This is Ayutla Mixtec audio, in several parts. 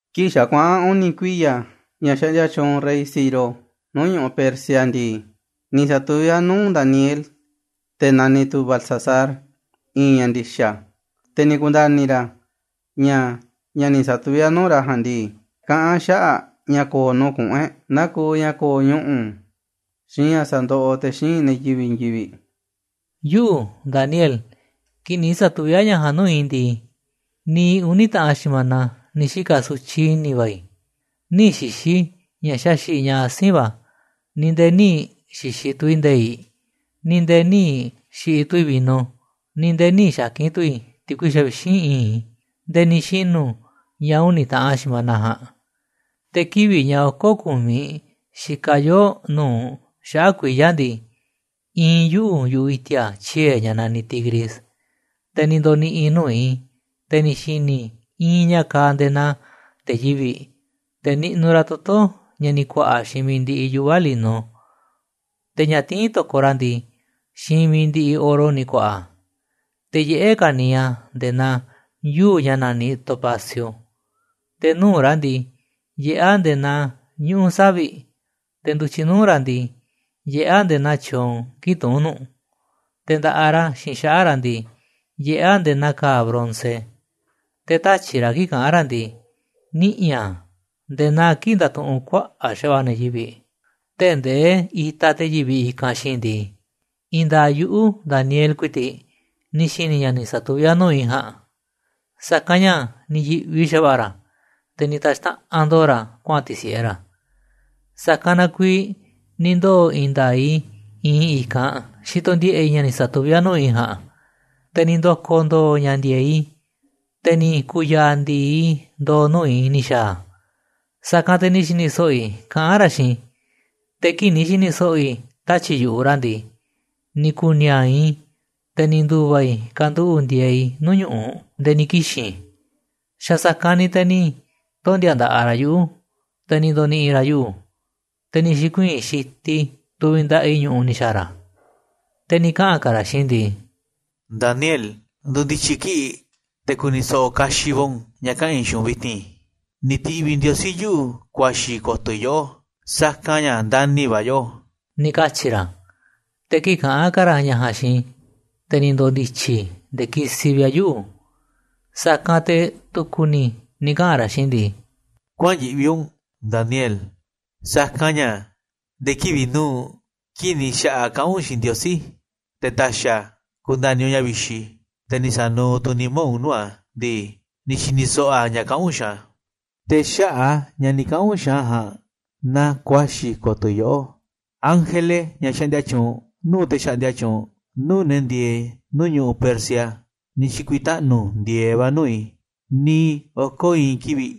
Kii̱ꞌ xa̱ kuaꞌa̱n uni̱ kuiya̱ ña̱ xaꞌndia tyuunꞌ rey Ciro nuu̱ꞌ ñu̱ꞌuꞌ Persia ndii, ni̱ sa̱tuví a̱ nuu̱ꞌ Daniel, te̱ naniꞌ tu̱ Beltsasar, i̱i̱n ña̱ ndi̱xa̱. Te̱ ni̱ ku̱nda̱ni̱ ra̱ ña̱ ña̱ ni̱ sa̱tuví a̱ nuu̱ꞌ ra̱ ja̱a̱nꞌ ndii, kaꞌán a̱ xaꞌa̱ꞌ ña̱ ko̱o̱ nuu̱ꞌ kuꞌu̱n e̱ꞌ, nakuuꞌ ña̱ ko̱o̱ ñuꞌu̱, xiinꞌ ña̱ sa̱ndoꞌoꞌ te̱ xíinꞌ ne̱ yivi̱ꞌ i̱i̱n yivi̱ꞌ. “Yuꞌu̱, Daniel, kii̱ꞌ ni̱ sa̱tuví a̱ ña̱ ja̱a̱nꞌ nuu̱ꞌ i̱ ndii, niiꞌ uni̱ taꞌan xi̱mana ni̱ xika̱ sutyiꞌ i̱ni̱ va̱ i̱. Nï̱ xi̱xi̱ i̱ ña̱ xaxi̱ꞌ ña̱ asi̱nꞌ va̱, ni̱ nde̱e̱ nï̱ xi̱xi̱ tu̱ i̱ nde̱i̱ꞌ, ni̱ nde̱e̱ nï̱ xi̱ꞌi̱ tu̱ i̱ vino, ni̱ nde̱e̱ nï̱ xa̱ki̱n tu̱ i̱ ti̱kui xavixínꞌ i̱i̱nꞌ i̱, nde̱e̱ ni̱ xinu̱ ña̱ uni̱ taꞌan xi̱mana ja̱a̱nꞌ. Te̱ kivi̱ꞌ ña̱ oko̱ ku̱miꞌ xikaꞌ yoo nu̱uꞌ xaꞌa̱ꞌ kuiya̱ ndii, iinꞌ yuꞌu̱ yu̱ꞌuꞌ i̱ti̱a̱ tyie̱ ña̱ naniꞌ Tigris. Te̱ ni̱ ndo̱ni̱ꞌi̱ i̱ nuu̱ꞌ i̱, te̱ ni̱ xini i̱ i̱i̱n ña̱ kaaꞌ nde̱e̱ naa te̱ yivi̱ꞌ, te̱ niꞌnuꞌ ra̱ toto̱ ña̱ ni̱ ku̱a̱ꞌa̱ xiinꞌ mi̱iꞌ ndiꞌiꞌ yuꞌva̱ lino, te̱ ña̱ tiín to̱koꞌ ra̱ ndii, xiinꞌ mi̱iꞌ ndiꞌiꞌ oro ni̱ ku̱a̱ꞌa̱ a̱. Te̱ yiꞌé ka̱niiꞌ a̱ nde̱e̱ naa yuu̱ꞌ ña̱ naniꞌ topacio, te̱ nuu̱ꞌ ra̱ ndii, yiꞌé a̱ nde̱e̱ naa ñuꞌu̱ savi̱ꞌ, te̱ ndu̱tyiꞌ nuu̱ꞌ ra̱ ndii, yiꞌé a̱ nde̱e̱ naa tyoon kii̱ꞌ tuún nuꞌ, te̱ nda̱ꞌaꞌ ra̱ xiinꞌ xaꞌa̱ꞌ ra̱ ndii, yiꞌé a̱ nde̱e̱ naa ka̱a̱ bronce, te̱ tatyi̱ꞌ ra̱ kii̱ꞌ kaꞌán ra̱ ndii, niꞌi̱ a̱ nde̱e̱ naa kii̱ꞌ ndatuꞌunꞌ kuaꞌa̱ꞌ xa̱va̱ꞌa̱ ne̱ yivi̱ꞌ. “Tee̱ꞌ ndee itaꞌ te̱ yivi̱ꞌ i̱kanꞌ xiinꞌ i̱ ndii, i̱i̱n nda̱a̱ꞌ yuꞌu̱, Daniel ku̱i̱ti̱ꞌ, ni̱ xi̱ni̱ ña̱ ni̱ sa̱tuví a̱ nuu̱ꞌ i̱ ja̱a̱nꞌ, sa̱kanꞌ ña̱ ni̱ yi̱ꞌvi xa̱va̱ꞌa̱ ra̱, te̱ ni̱ ta̱xtaꞌan ndo̱o̱ ra̱ kuaꞌa̱n ti̱si̱ꞌe ra̱. Sa̱kanꞌ na kuiiꞌ ni̱ ndoo̱ i̱i̱n nda̱a̱ꞌ i̱ iinꞌ i̱ i̱kanꞌ xitoꞌ ndiꞌe̱ꞌ i̱ ña̱ ni̱ sa̱tuví a̱ nuu̱ꞌ i̱ ja̱a̱nꞌ. Te̱ ni̱ ndo̱ko̱ ndo̱o̱ ña̱ ndi̱e̱eꞌ i̱, te̱ ni̱ ku̱u̱ ya̱a̱ ndi̱i ndo̱o̱ nuu̱ꞌ i̱ ni̱ xa̱a̱ a̱. Sa̱kanꞌ te̱ ni̱ xi̱ni̱ so̱ꞌo̱ i̱ kaꞌán ra̱ xiinꞌ i̱. Te̱ kii̱ꞌ ni̱ xi̱ni̱ so̱ꞌo̱ i̱ tatyi̱ꞌ yu̱ꞌuꞌ ra̱ ndii, ni̱ ku̱u̱ ni̱a̱a̱ꞌ i̱, te̱ ni̱ ndu̱va̱ i̱ kanduꞌu̱ꞌ ndieeꞌ i̱ nuu̱ꞌ ñu̱ꞌuꞌ, nde̱e̱ ni̱ kixi̱n i̱. Xa̱ sa̱kanꞌ ni̱ te̱ ni̱ tondi̱a̱ nda̱ꞌaꞌ ra̱ yuꞌu̱, te̱ ni̱ ndo̱ni̱ꞌi̱ ra̱ yuꞌu̱, te̱ ni̱ xi̱kuii̱n xitiꞌ i̱ tuviꞌ nda̱ꞌaꞌ i̱ ñu̱ꞌuꞌ ni̱ xa̱a̱ ra̱. Te̱ ni̱ kaꞌa̱n ka̱ ra̱ xiinꞌ i̱ ndii: ‘Daniel, ndo̱ndi̱tyi̱ kiꞌi̱ꞌ te̱ ku̱ni̱ so̱ꞌo̱ kaxiꞌ va̱ u̱nꞌ ña̱ kaꞌa̱n i̱ xiinꞌ u̱nꞌ vi̱ti̱n. Ni̱ ti̱ꞌviꞌ Ndiosí yuꞌu̱ kuaxi̱ ko̱to̱ i̱ yoꞌó, sa̱kanꞌ ña̱ ndani̱ va̱ a̱ yoꞌó,’ ni̱ katyi̱ ra̱. “Te̱ kii̱ꞌ kaꞌán ka̱ ra̱ ña̱ ja̱a̱nꞌ xiinꞌ i̱, te̱ ni̱ ndo̱ndi̱tyi̱ i̱ nde̱e̱ kisiꞌ vi̱ꞌ a̱ yuꞌu̱. Sa̱kanꞌ te̱ tu̱ku̱ ni̱ ni̱ kaꞌa̱n ra̱ xiinꞌ i̱ ndii: ‘Kuäa̱n yiꞌvi u̱nꞌ, Daniel, sa̱kanꞌ ña̱ nde̱e̱ kivi̱ꞌ nu̱uꞌ kii̱ꞌ ni̱ xa̱ꞌaꞌ kaꞌán u̱nꞌ xiinꞌ Ndiosí, te̱ ta̱xi̱ a̱ ku̱nda̱ni̱ u̱nꞌ ña̱ vixi, te̱ ni̱ sa̱nuuꞌ tu̱ u̱nꞌ nimá u̱nꞌ nuu̱ꞌ a̱ ndii, ni̱ xi̱ni̱ so̱ꞌo̱ a̱ ña̱ kaꞌán u̱nꞌ xiinꞌ a̱. Te̱ xaꞌa̱ꞌ a̱ ña̱ ni̱ kaꞌa̱n u̱nꞌ xiinꞌ a̱ ja̱a̱nꞌ na kuaxi̱ ko̱to̱ i̱ yoꞌó. Ángele, ña̱ xaꞌndia tyuunꞌ nuu̱ꞌ te̱ xaꞌndia tyuunꞌ nuu̱ꞌ ne̱ ndi̱e̱e̱ꞌ nuu̱ꞌ ñu̱ꞌuꞌ Persia, ni̱ xi̱ku̱i̱taꞌnu̱ ndi̱e̱eꞌ va̱ nuu̱ꞌ i̱ niiꞌ oko̱ i̱i̱n kivi̱ꞌ,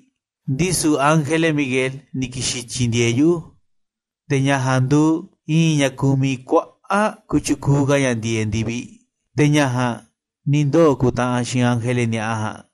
ndisu̱ ángele Miguel ni̱ ki̱xi̱n tyi̱ndi̱e̱eꞌ yuꞌu̱. Te̱ ña̱ ja̱a̱nꞌ nduuꞌ i̱i̱n ña̱ kumiꞌ kuaꞌa̱ꞌ kotyukuuꞌ ka̱ ña̱ ndi̱e̱eꞌ ndi̱viꞌ. Te̱ ña̱ ja̱a̱nꞌ ni̱ ndoo̱ kuntaꞌanꞌ xiinꞌ ángele ni̱a̱ꞌa ja̱a̱nꞌ.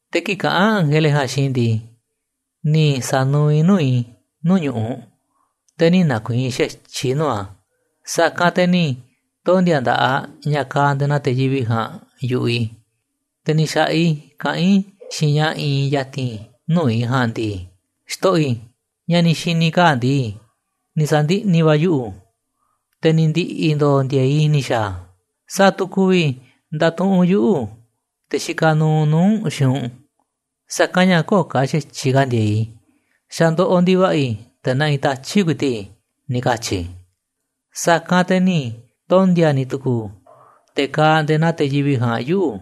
“Te̱ kii̱ꞌ kaꞌán ángele ja̱a̱nꞌ xiinꞌ i̱ ndii, ni̱ sa̱nuuꞌ i̱ nuu̱ꞌ i̱ nuu̱ꞌ ñu̱ꞌuꞌ, te̱ nï̱ nakuiinꞌ xa̱tyiꞌ i̱ nuu̱ꞌ a̱. Sa̱kanꞌ te̱ ni̱ tondi̱a̱ nda̱ꞌaꞌ ña̱ kaaꞌ nde̱e̱ naa te̱ yivi̱ꞌ ja̱a̱nꞌ yu̱ꞌuꞌ i̱, te̱ ni̱ xa̱ꞌaꞌ i̱ kaꞌán i̱ xiinꞌ ña̱ iinꞌ ya̱ti̱n nuu̱ꞌ i̱ ja̱a̱nꞌ ndii: ‘Xto̱ꞌo̱ i̱, ña̱ ni̱ xi̱ni̱ i̱ kaa̱ꞌ ndii, ni̱ sa̱ndiꞌni̱ va̱ a̱ yuꞌu̱, te̱ ni̱ ndi̱ꞌi̱ ndo̱o̱ ndi̱e̱e̱ꞌ i̱ ni̱ xa̱a̱ a̱. ¿Sa̱a̱ tu̱ ku̱vi̱ nda̱tuꞌunꞌ yuꞌu̱, te̱ xikaꞌ nuuꞌ nuu̱ꞌ u̱nꞌ, xiinꞌ u̱nꞌ? Sa̱kanꞌ ña̱ kö̱o̱ ka̱ xa̱tyiꞌ ka̱ ndi̱e̱e̱ꞌ i̱, xa̱ ndoꞌoꞌ ndi̱va̱ꞌa̱ i̱, te̱ naꞌinꞌ tatyi̱ꞌ ku̱i̱ti̱ꞌ i̱,’ ni̱ katyi̱ i̱. “Sa̱kanꞌ te̱ ni̱ tondi̱a̱ ni̱ tu̱ku̱u̱ te̱ kaaꞌ nde̱e̱ naa te̱ yivi̱ꞌ ja̱a̱nꞌ yuꞌu̱,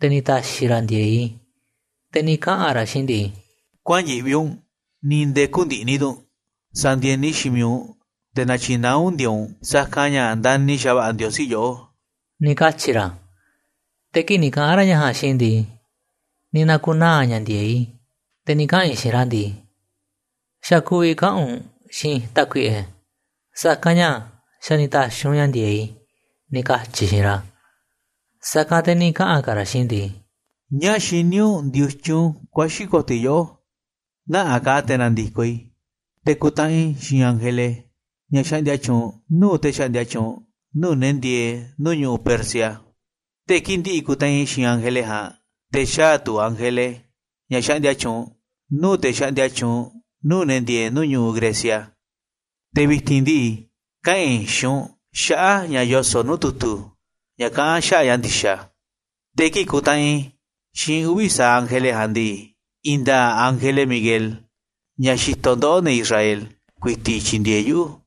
te̱ ni̱ ta̱xi̱ ra̱ ndi̱e̱e̱ꞌ i̱, te̱ ni̱ kaꞌa̱n ra̱ xiinꞌ i̱ ndii: ‘Kuäa̱n yiꞌvi u̱nꞌ, ni̱ nde̱e̱ kü̱ndi̱ꞌni̱ tu̱ u̱nꞌ, sa̱ndi̱e̱ni xiinꞌ mi̱iꞌ u̱nꞌ, te̱ na̱tyi̱naá u̱nꞌ ndi̱e̱e̱ꞌ u̱nꞌ, sa̱kanꞌ ña̱ ndani̱ xa̱va̱ꞌa̱ Ndiosí yoꞌó,’ ni̱ katyi̱ ra̱. “Te̱ kii̱ꞌ ni̱ kaꞌa̱n ra̱ ña̱ ja̱a̱nꞌ xiinꞌ i̱ ndii, ni̱ na̱ku̱naa̱ ña̱ ndi̱e̱eꞌ i̱, te̱ ni̱ kaꞌa̱n i̱ xiinꞌ ra̱ ndii: ‘Xa̱ ku̱vi̱ kaꞌa̱n u̱nꞌ xiinꞌ i̱, Tákuiꞌe, sa̱kanꞌ ña̱ xa̱ ni̱ ta̱xi̱ u̱nꞌ ña̱ ndi̱e̱eꞌ i̱,’ ni̱ katyi̱ i̱ xiinꞌ ra̱. “Sa̱kanꞌ te̱ ni̱ kaꞌa̱n ka̱ ra̱ xiinꞌ i̱ ndii: ‘¿Ñáá xiní u̱nꞌ ndiotyun kuaxi̱ ko̱to̱ i̱ yoꞌó? Nä̱ꞌanꞌ ka̱ te̱ na̱ndi̱koꞌ i̱ te̱ ku̱ntaꞌanꞌ i̱ xiinꞌ ángele ña̱ xaꞌndia tyuunꞌ nuu̱ꞌ te̱ xaꞌndia tyuunꞌ nuu̱ꞌ ne̱ ndieeꞌ nuu̱ꞌ ñu̱ꞌuꞌ Persia. Te̱ kii̱ꞌ ndi̱ꞌi̱ ku̱ntaꞌanꞌ i̱ xiinꞌ ángele ja̱a̱nꞌ, te̱ xaa̱ tu̱ ángele ña̱ xaꞌndia tyuunꞌ nuu̱ꞌ te̱ xaꞌndia tyuunꞌ nuu̱ꞌ ne̱ ndieeꞌ nuu̱ꞌ ñu̱ꞌuꞌ Grecia. Te̱ vi̱ti̱n ndii, kaꞌa̱n i̱ xiinꞌ u̱nꞌ xaꞌa̱ꞌ ña̱ yoso̱ꞌ nuu̱ꞌ tu̱tu̱ ña̱ kaꞌán xaꞌa̱ꞌ ña̱ ndi̱xa̱. Te̱ kii̱ꞌ kuntaꞌanꞌ i̱ xiinꞌ uvi̱ sa̱aꞌ ángele ja̱a̱nꞌ ndii, i̱i̱n nda̱a̱ꞌ ángele Miguel, ña̱ xitoꞌ ndoꞌó, ne̱ Israel, ku̱i̱ti̱ꞌ tyindieeꞌ yuꞌu̱.